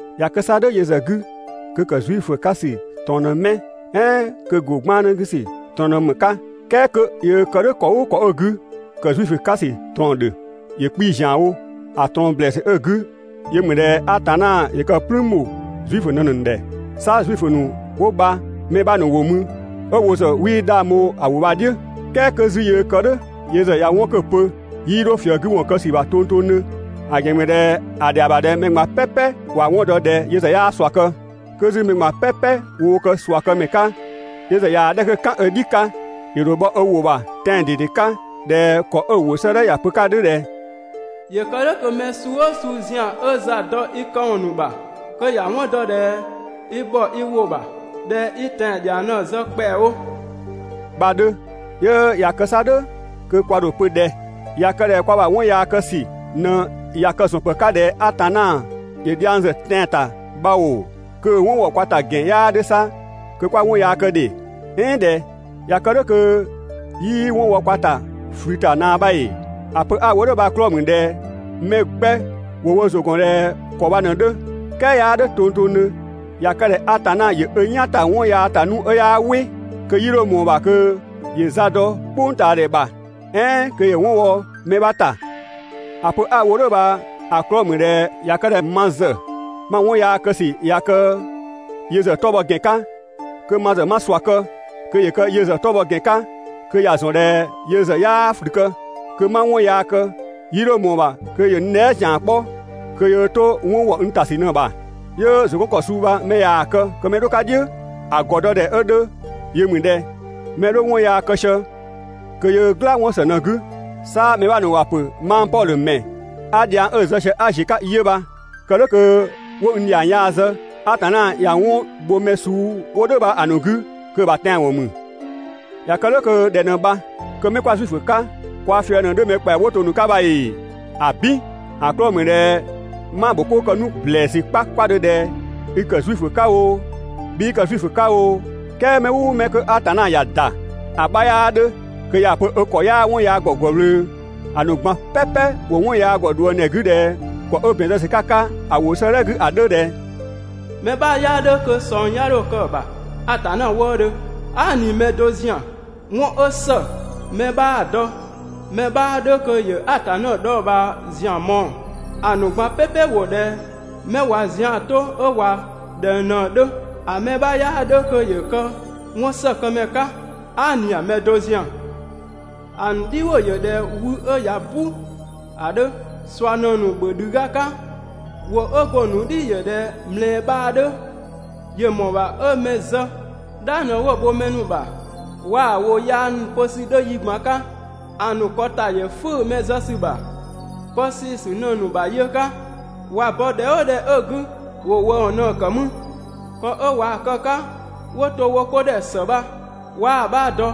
꞊Ya kë 'sa "dhʋ̈ yö ‑zë 'gü kö ‑kë Zuifö 'ka ‑sü ꞊trɔɔn ꞊në 'mɛ? "Ɛɛn kö ‑go 'gbannë 'gü ‑sü ꞊trɔɔn ‑mü ‑më 'ka? "Kɛɛ 'kö yöö kë "dhʋ̈ ‑kɔ "ʋʋ ‑kɔ 'ö‑ 'gü, ‑kë Zuifö 'ka ‑sü ꞊trɔɔn‑ ‑dhö. ‑Yö 'kpii‑ ‑zianwo. ‑A ꞊trɔɔn ‑blɛɛsü 'ö‑ 'gü yö ‑mü ꞊dhɛ Atanna ‑yö kë "plüün ‑bho Zuifö ‑nu ꞊në‑ ‑nu ‑dhɛ. 'Sa Zuifö ‑nu 'wo bha‑ mɛ 'bha ‑nu ‑wo mü 'ö wo ‑zë 'wii 'dhang bho‑ ‑wʋ bha‑ "dhiʋ̈, "Kɛɛ 'kö 'zü yöö kë "dhʋ̈, yö ‑zë ꞊ya 'wɔn 'kö‑ pö, 'yii 'dho ꞊fië‑ 'gü ‑wɔn kë ‑sü ‑bha tongtongdhö. ‑A ‑gɛn ‑mü ꞊dhɛ ‑a ‑dhɛa ‑bha ꞊dhɛ mɛ ꞊gban "pɛpɛ ‑wa 'wɔn dɔ ꞊dhɛ yö ‑zë 'yaa ꞊sua kë. 'Kö 'zü mɛ ꞊gban "pɛpɛ woo kë ꞊sua këmɛ 'ka, yö ‑zë ꞊yaa‑ 'dhɛ 'kö "kan ö "dhi 'ka, ‑yö ‑dho bhɔ ö ‑wʋ ‑bha tɛan‑ ꞊dede 'ka ꞊dhɛ ‑kɔ 'ö‑ ‑wʋ 'sëëdhɛ ‑ya pö‑ 'ka ‑a 'dhö ꞊dhɛ: «‑Yö kë "dhʋ̈ kö mɛ suu "ʋʋ suu ‑zian 'ö za dɔ i këwɔn ‑nu ‑bha, kö ‑ya 'wɔn dɔ ꞊dhɛ i ‑bhɔ i ‑wʋ ‑bha, ꞊dhɛ i tɛan‑ ‑dhiang ꞊në‑ zë ‑kpɛawo» bha‑ 'dhö. 'Yö ꞊ya kë 'sa "dhʋ̈ kö kwa ‑dho ‑a pö ꞊dhɛ? ꞊Ya kë ꞊dhɛ kwa ‑bha 'wɔn yaa kë ‑sü ꞊në ꞊ya kë‑ ‑zɔn ‑pë 'ka ꞊dhɛ Atanna ‑yö dhiang ‑zë tɛan‑ ‑ta bha ‑oo, kö‑ 'wɔn ‑wɔ kwa ‑ta ‑gɛn 'yaa 'dhö 'sa kö 'kwa 'wɔn yaa kë ‑dhe! "Ɛɛn ꞊dhɛ? ꞊Ya kë "dhʋ̈ kö 'yii 'wɔn wɔ kwa ‑ta ꞊flü ‑ta ꞊naa bha ‑ee? ‑A pö 'a‑ wo "dhʋ̈ bha‑ 'klɔɔ‑ ‑mü ꞊dhɛ mɛ 'gbɛ ‑wo wo ‑zʋ ‑gɔn ꞊dhɛ ‑kɔ bha ꞊në‑ 'dhö. "Kɛɛ 'yaa "dhʋ̈ tongtongdhö! ꞊Ya kë ꞊dhɛ Atanna ‑yö ö "yan ‑ta 'wɔn yaa ‑ta nu 'ö 'yaa "wɩ, kö 'yii 'dho ‑mɔɔ ‑bha kö ‑yö za dɔ "kpʋngtaadhɛ ‑bha, "ɛɛn kö ‑yö 'wɔn wɔ mɛ 'bha ‑ta! ‑A pö 'a‑ wo "dhʋ̈ bha‑ 'klɔɔ‑ ‑mü ꞊dhɛ ꞊ya kë ꞊dhɛ ma ‑zë ma 'wɔn yaa kë ‑sü ꞊ya kë‑ yö ‑zë 'tɔ bhɔ ‑gɛn 'ka, kö ma ‑zë 'ma ꞊sua kë kö ‑yö kë yö ‑zë 'tɔ bhɔ ‑gɛn 'ka kö ‑ya ‑zɔn ꞊dhɛ yö ‑zë 'yaa ꞊flü kë, kö 'ma 'wɔn yaa kë 'yii 'dho ꞊mɔɔ‑ ‑bha kö ‑yö n dhɛɛ" ‑zian 'kpɔ kö yöö 'to 'wɔn ‑wɔ n ‑ta ‑sü ꞊në‑ ‑bha. 'Yö ‑zʋ 'gɔn ‑kɔ suu bha mɛ ꞊yaa‑ kë kö mɛ‑ 'dho‑ 'ka "dhiʋ̈, ‑a ‑gɔ dɔ ‑dhɛ 'ö 'dhö yö ‑mü ꞊dhɛ: Mɛ 'dhö 'wɔn yaa kë sië kö yöö "gla 'wɔn ‑së ꞊në‑ 'gü. 'Sa mɛ 'bha ‑nu ‑wa ‑pö mang Pɔdhö ‑mɛ 'a dhiang 'ö‑ zë sië 'a ‑ziö 'ka 'yö bha. Kë "dhʋ̈ kö 'wo n ‑dhiang yaa zë. Atanna ꞊ya 'wɔn bho mɛ suu 'wo "dhʋ̈ bha‑ ‑nu 'gü kö‑ ‑bha tɛanwɔn ‑mü. ꞊Ya kë "dhʋ̈ kö ꞊dhɛ ꞊në bha? Kö mɛ 'kwa Zuifö 'ka, kwa fië‑ ꞊në 'dhö mɛ ‑kpɛa 'wo to‑ ‑nu 'ka bha ‑ee? ‑Abin! ‑A 'klɔɔ‑ ‑mü ꞊dhɛ 'ma‑ ‑bho 'koo kë 'nu ‑blɛɛsü 'kpakpadhö ꞊dhɛ i ‑kë Zuifö 'ka oo, 'bhii kë Zuifö 'ka oo, "kɛɛ mɛ "ʋʋ mɛ kö Atanna ‑ya ‑da, ‑a 'bha 'yaa 'dhö kö ‑ya pö ö ‑kɔ 'yaa 'wɔn yaa ‑gɔ ‑gwë ꞊wlöö. ‑A ‑nu ꞊gban "pɛpɛ ‑wo 'wɔn yaa ‑gɔ ꞊dhuëngdhɛ 'gü ꞊dhɛ ‑kɔ 'ö ‑bɛn zë ‑sü 'ka‑ 'ka ‑a ‑wʋ 'sëëdhɛ 'gü ‑a 'dhö ꞊dhɛ: «Mɛ 'bha 'yaa 'dhö kö ꞊sɔng 'ya 'dho kë‑ ‑bha Atanna wëëdhö, aa" ꞊ni mɛ do ‑zian. 'Wɔn 'ö ‑së, mɛ 'bhaa‑ dɔ. Mɛ 'bhaa 'dhö kö ‑yö Atanna dhɔɔbhaa ‑zian mɔɔ‑, ‑a ‑nu ꞊gban "pɛpɛ ‑wo ꞊dhɛ 'mɛ ꞊wa zian 'to 'ö ꞊wa ꞊dhɛng ꞊në‑ 'dhö. ‑A mɛ 'bha 'yaa 'dhö kö ‑yö kë 'wɔnsëkëmɛ 'ka, aa" ꞊ni mɛ do ‑zian. ‑A ‑nu "dhiwʋ ‑yö ꞊dhɛ wü 'ö ꞊ya "bu ‑a 'dhö. ꞊Sua ꞊në‑ ‑nu ‑bhö ‑dhü ga 'ka. ‑Wʋ 'ö go‑ ‑nu "dhi ‑yö ꞊dhɛ ꞊mlɛɛ bhaa 'dhö, ‑yö ‑mɔɔ ‑bha 'ö mɛ zë. "Dhang ꞊në 'wo‑ bho mɛ ‑nu ‑bha waa‑ ‑wʋ yaa ‑nu pö ‑sü 'dhö yi ꞊gban 'ka. ‑A ‑nu ‑kɔ ‑ta ‑yö 'fʋ̈ʋ̈‑ mɛ zë ‑sü ‑bha. Pë seesü ꞊në‑ ‑nu ‑bha yë 'ka, ꞊wa bɔ ‑dhɛ "ʋʋ ‑dhɛ 'ö‑ 'gü, ‑wo ‑wëëwɔn ꞊në‑ ‑kë mü. ‑Kɔ 'ö ꞊wa kë‑ 'ka 'wo to wo 'ko ‑dhɛ ‑së bha 'waa‑ 'bha dɔ.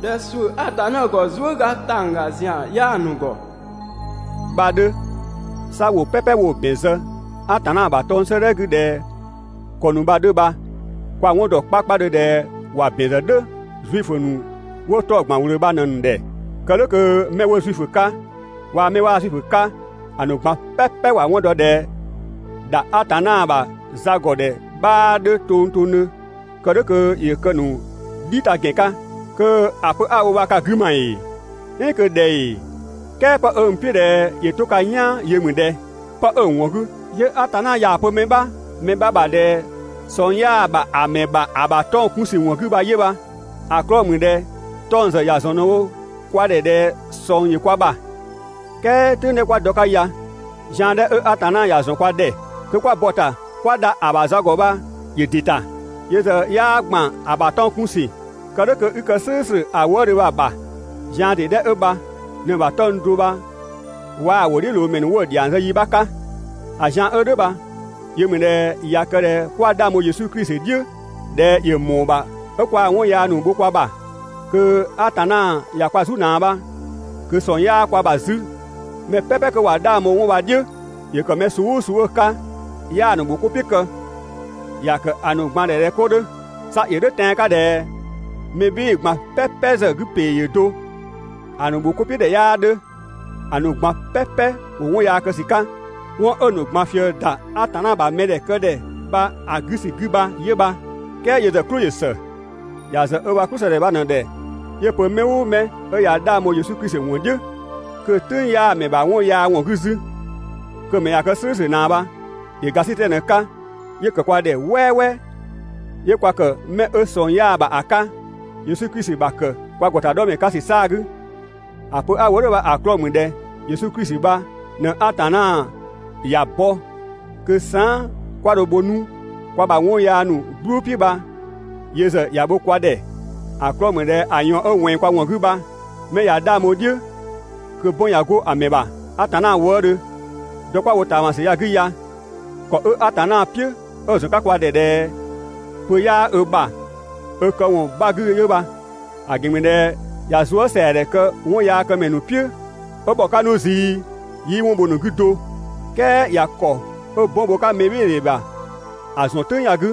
꞊Dhɛ ‑suʋ̈ Atanna ‑gɔ zuëga ‑tangga ‑zian 'yaa‑ ‑nu ‑gɔ bha‑ 'dhö. 'Sa ‑wʋ "pɛpɛ 'wo‑ ‑bɛn zë Atanna ‑bha 'tɔng‑ 'sëëdhɛ 'gü ꞊dhɛ ‑kɔ ‑nu bha‑ 'dhö bha, kwa‑ 'wɔn ‑dɔ 'kpakpadhö ꞊dhɛ ‑wa ‑bɛn zë "dhʋ̈ Zuifö ‑nu 'wo 'tɔng‑ ‑gban ꞊wlöö bha ꞊në‑ ‑nu ‑dhɛ. Kë "dhʋ̈ kö mɛ 'wo Zuifö 'ka waa‑ 'mɛ 'waa Zuifö 'ka, ‑a ‑nu ꞊gban "pɛpɛ ‑wa 'wɔn dɔ ꞊dhɛ ‑dha Atanna ‑bha za ‑gɔ ‑dhɛ 'bhaa 'dhö tongtongdhö, kë "dhʋ̈ kö ‑yö kë‑ ‑nu "dhi ta ‑gɛn 'ka. (Kö ‑a pö 'a‑ wo bha ka‑ 'gü ma ‑ee, "ɛɛn kö ꞊dhɛ ‑ee? "Kɛɛ 'pë n "piʋ̈ ꞊dhɛ ‑yö 'to ka "yaan yö ‑mü ꞊dhɛ:) Pë 'ö‑ ‑wɔn 'gü, 'yö Atanna 'yaa‑ pö mɛ 'bha ‑bha ꞊dhɛ ꞊sɔng 'yaa‑ ‑bha ‑a ‑mɛ ‑bha ‑a ‑bha 'tɔng‑ 'kun ‑sü ‑wɔn 'gü bha 'yö bha. ‑A 'klɔɔ‑ ‑mü ꞊dhɛ 'tɔng‑ ‑zë ‑ya ‑zɔn ꞊në‑ wo kwa ‑dhɛ ꞊dhɛ sɔng ‑yö kwa ‑bha. "Kɛɛ "tʋ̈ng 'dhɛ 'kwa dɔ‑ 'ka ya, zian 'dhɛ 'ö Atanna ‑ya ‑zɔn kwa ‑dhɛ kö 'kwa bɔ‑ ‑ta 'kwa dha ‑a ‑bha za ‑gɔ bha ‑yö ‑dɩ ‑ta. Yö ‑zë 'yaa ‑gban ‑a ‑bha 'tɔng‑ 'kun ‑sü, kë "dhʋ̈ kö 'i kë "slʋ̈ʋ̈slʋ̈ ‑a wëëdhö bha‑ ‑bha. Zian ‑dee 'dhɛ 'ö bha ꞊në‑ ‑bha 'tɔng‑ do bha waa‑ ‑wʋdhiʋ̈loomɛ ‑nu 'wo‑ ‑dhiang zë yi 'bha 'ka. ‑A zian 'ö "dhʋ̈ bha yö ‑mü ꞊dhɛ ꞊ya kë ꞊dhɛ 'kwa 'dhang bho Yesu Klisi "dhiʋ̈ ꞊dhɛ ‑yö ‑mɔɔ ‑bha 'ö kwaa‑ 'wɔn yaa ‑nu bho kwa ‑bha, kö Atanna ꞊ya kwa "zu ꞊naa bha, kö ꞊sɔng 'yaa kwa ‑bha 'zü. Mɛ "pɛpɛ 'kö ꞊wa 'dhang bho 'wɔn bha‑ "dhiʋ̈, ‑yö ‑kë mɛ suu "ʋʋ suu 'ö‑ 'ka, 'yaa‑ ‑nu ‑bho 'ko "piʋ̈ kë, ‑ya ‑kë ‑a ‑nu ꞊gban ‑dhɛ ꞊dhɛ 'ko 'dhö. 'Sa ‑yö "dhʋ̈ tɛan‑ 'ka ꞊dhɛ mɛ "bhɩɩ‑ ꞊gban "pɛpɛ ‑zë 'gü ‑pee ‑yö do, ‑a ‑nu ‑bho 'ko "piʋ̈ ‑dhɛ 'yaa 'dhö, ‑a ‑nu ꞊gban "pɛpɛ ‑wo 'wɔn yaa kë ‑sü 'ka. 'Wɔn 'ö‑ ‑nu ꞊gban ꞊fië ‑da Atanna ‑bha mɛdhɛ këdhɛ bha‑ 'gü ‑sü 'gü bha 'yö bha. "Kɛɛ yö ‑zë "klʋ ‑yö ‑së. ‑Ya ‑zë ö ‑bha "klʋ ‑së ‑dhɛ bha ꞊në‑ ‑dhɛ 'yö‑ pö mɛ "ʋʋ mɛ 'ö ꞊ya 'dhang bho Yesu Klisi ‑wɔn "dhiʋ̈, kö‑ "tʋ̈ng 'yaa‑ ‑mɛ ‑bha 'wɔn yaa ‑wɔn 'gü 'zü, kö‑ ‑mɛ ꞊ya kë "slʋ̈ʋ̈slʋ̈ ꞊naa bha. ‑Yö ‑gasitɛ ꞊në‑ 'ka 'yö‑ ‑kë kwa ‑dhɛ "wɛɛwɛɛ, 'yö kwa kë 'mɛ 'ö ꞊sɔng 'yaa‑ ‑bha ‑a 'ka, Yesu Klisi ‑bha ‑kë kwa ‑gɔtadhɔmɛ 'ka ‑sü 'saa‑ 'gü. ‑A pö 'a‑ wo "dhʋ̈ bha‑ 'klɔɔ‑ ‑mü ꞊dhɛ Yesu Klisi bha ꞊në Atanna ‑ya bɔ kö saan" 'kwa dho‑ bho 'nu kwa ‑bha 'wɔn yaa ‑nu "gblʋʋ "piʋ̈ bha yö ‑zë ‑ya bho kwa ‑dhɛ, ‑a 'klɔɔ‑ ‑mü ꞊dhɛ ‑a ꞊yɔɔn 'ö ꞊wɛnng kwa ‑wɔn 'gü bha 'mɛ ꞊ya 'dhang bho‑ "dhiʋ̈, kö 'bɔn ꞊ya 'go‑ ‑mɛ ‑bha Atanna wëëdhö. Dɔ 'kwa‑ wo ꞊taamasü ya‑ 'gü ya, ‑kɔ 'ö Atanna "piʋ̈ 'ö‑ ‑zɔn 'ka kwa ‑dhɛ ꞊dhɛ pö 'yaa ö ‑bha ö këwɔn 'bha 'gü 'yö bha. ‑A ‑gɛn ‑mü ꞊dhɛ ꞊ya zuësɛadhɛ kë 'wɔnyaakëmɛ ‑nu "piʋ̈ 'ö ‑bhɔ 'ka 'nu zii, 'yii 'wɔn bho‑ ‑nu 'gü do. ("Kɛɛ ꞊ya ‑kɔ 'ö 'bɔn bho‑ 'ka mɛbhɩɩdhe ‑bha ‑a ‑zɔn "tʋ̈ng ya‑ 'gü.)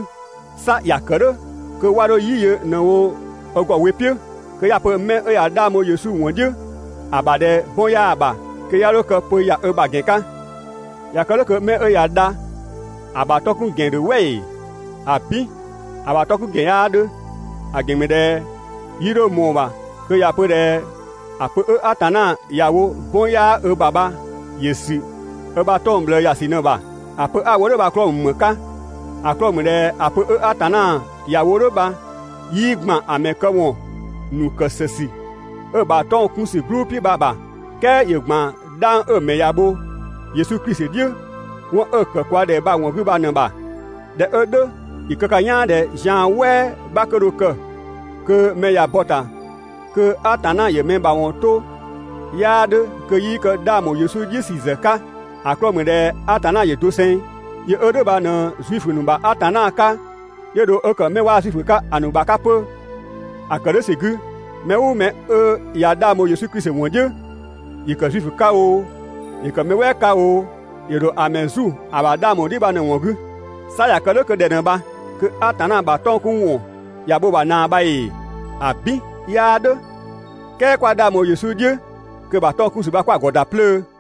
'Sa ‑ya ‑kë "dhʋ̈ kö 'wa 'dho "yi ꞊në yö ö ‑gɔ we "piʋ̈, kö 'ya‑ pö 'mɛ 'ö ꞊ya 'dhang bho Yesu ‑wɔn "dhiʋ̈ ‑a ‑bha ꞊dhɛ 'bɔn 'yaa‑ ‑bha, kö 'ya 'dho kë pö ‑ya ö ‑bha ‑gɛn 'ka. ꞊Ya kë "dhʋ̈ kö 'mɛ 'ö ꞊ya dha ‑a ‑bha ö 'tɔ 'kun ‑gɛn ‑dhö "wɛ ‑ee? ‑Abin! ‑A ‑bha ö 'tɔ 'kun ‑gɛn 'yaa 'dhö! ‑A ‑gɛn ‑mü ꞊dhɛ 'yii 'dho ꞊mɔɔ‑ ‑bha kö ‑ya pö ꞊dhɛ ‑a pö 'ö Atanna ‑ya wo 'bɔn 'yaa ö ‑bha bha ‑yö ‑sü 'ö ‑bha 'tɔng‑ ꞊bhlëë ‑ya ‑sü ꞊në‑ ‑bha. ‑A pö 'a‑ wo "dhʋ̈ bha‑ 'klɔɔ‑ ‑mü ‑më 'ka? ‑A 'klɔɔ‑ ‑mü ꞊dhɛ ‑a pö 'ö Atanna ‑ya wo "dhʋ̈ bha 'yii ‑gban ‑a ‑mɛ këwɔn ‑nu ‑kë ‑së ‑sü 'ö‑ ‑bha 'tɔng‑ 'kun ‑sü "gblʋʋ "piʋ̈ bha‑ ‑bha. "Kɛɛ ‑yö ‑gban 'dhang 'ö‑ ‑mɛ ‑ya bho Yesu Klisi "dhiʋ̈, 'wɔn 'ö‑ ‑kë kwa ‑dhɛ bha‑ ‑wɔn 'gü bha ꞊në‑ ‑bha. ꞊Dhɛ 'ö "dhʋ̈, ‑yö kë ka "yaan ꞊dhɛ zian "wɛɛ 'bha kö dho kë kö mɛ ꞊ya bɔ‑ ‑ta kö Atanna ‑yö mɛ ‑mawɔn 'to 'yaa 'dhö kö 'yii kë 'dhang ‑bho Yesu "dhiʋ̈ ‑sü ‑zë 'ka. ‑A 'klɔɔ‑ ‑mü ꞊dhɛ Atanna ‑yö doseng, yö 'ö "dhʋ̈ bha ꞊në Zuifö ‑nu ‑bha Atanna 'ka 'yö dho 'ö kë 'mɛ 'waa Zuifö 'ka‑ ‑nu ‑bha 'ka 'pö. ‑A ‑kë "dhʋ̈ ‑sü 'gü, mɛ "ʋʋ mɛ 'ö ꞊ya 'dhang bho Yesu Klisi ‑wɔn "dhiʋ̈, ‑yö ‑kë Zuifö 'ka oo, ‑yö kë mɛ "wɛɛ 'ka oo, ‑yö ‑dho ‑a ‑mɛ "zu ‑a ‑bha 'dhang ‑bho "dhiʋ̈ bha ꞊në‑ ‑wɔn 'gü. 'Sa ꞊ya kë "dhʋ̈ kö ꞊dhɛ ꞊në bha? Kö Atanna ‑bha 'tɔng‑ 'kun ‑wɔn ꞊ya bho‑ ‑bha ꞊naa bha ‑ee? ‑Abin, 'yaa "dhʋ̈! "Kɛɛ 'kwa 'dhang bho Yesu "dhiʋ̈, kö‑ ‑bha 'tɔng‑ 'kun ‑sü bha 'kwa‑ ‑gɔ ‑da 'plöö.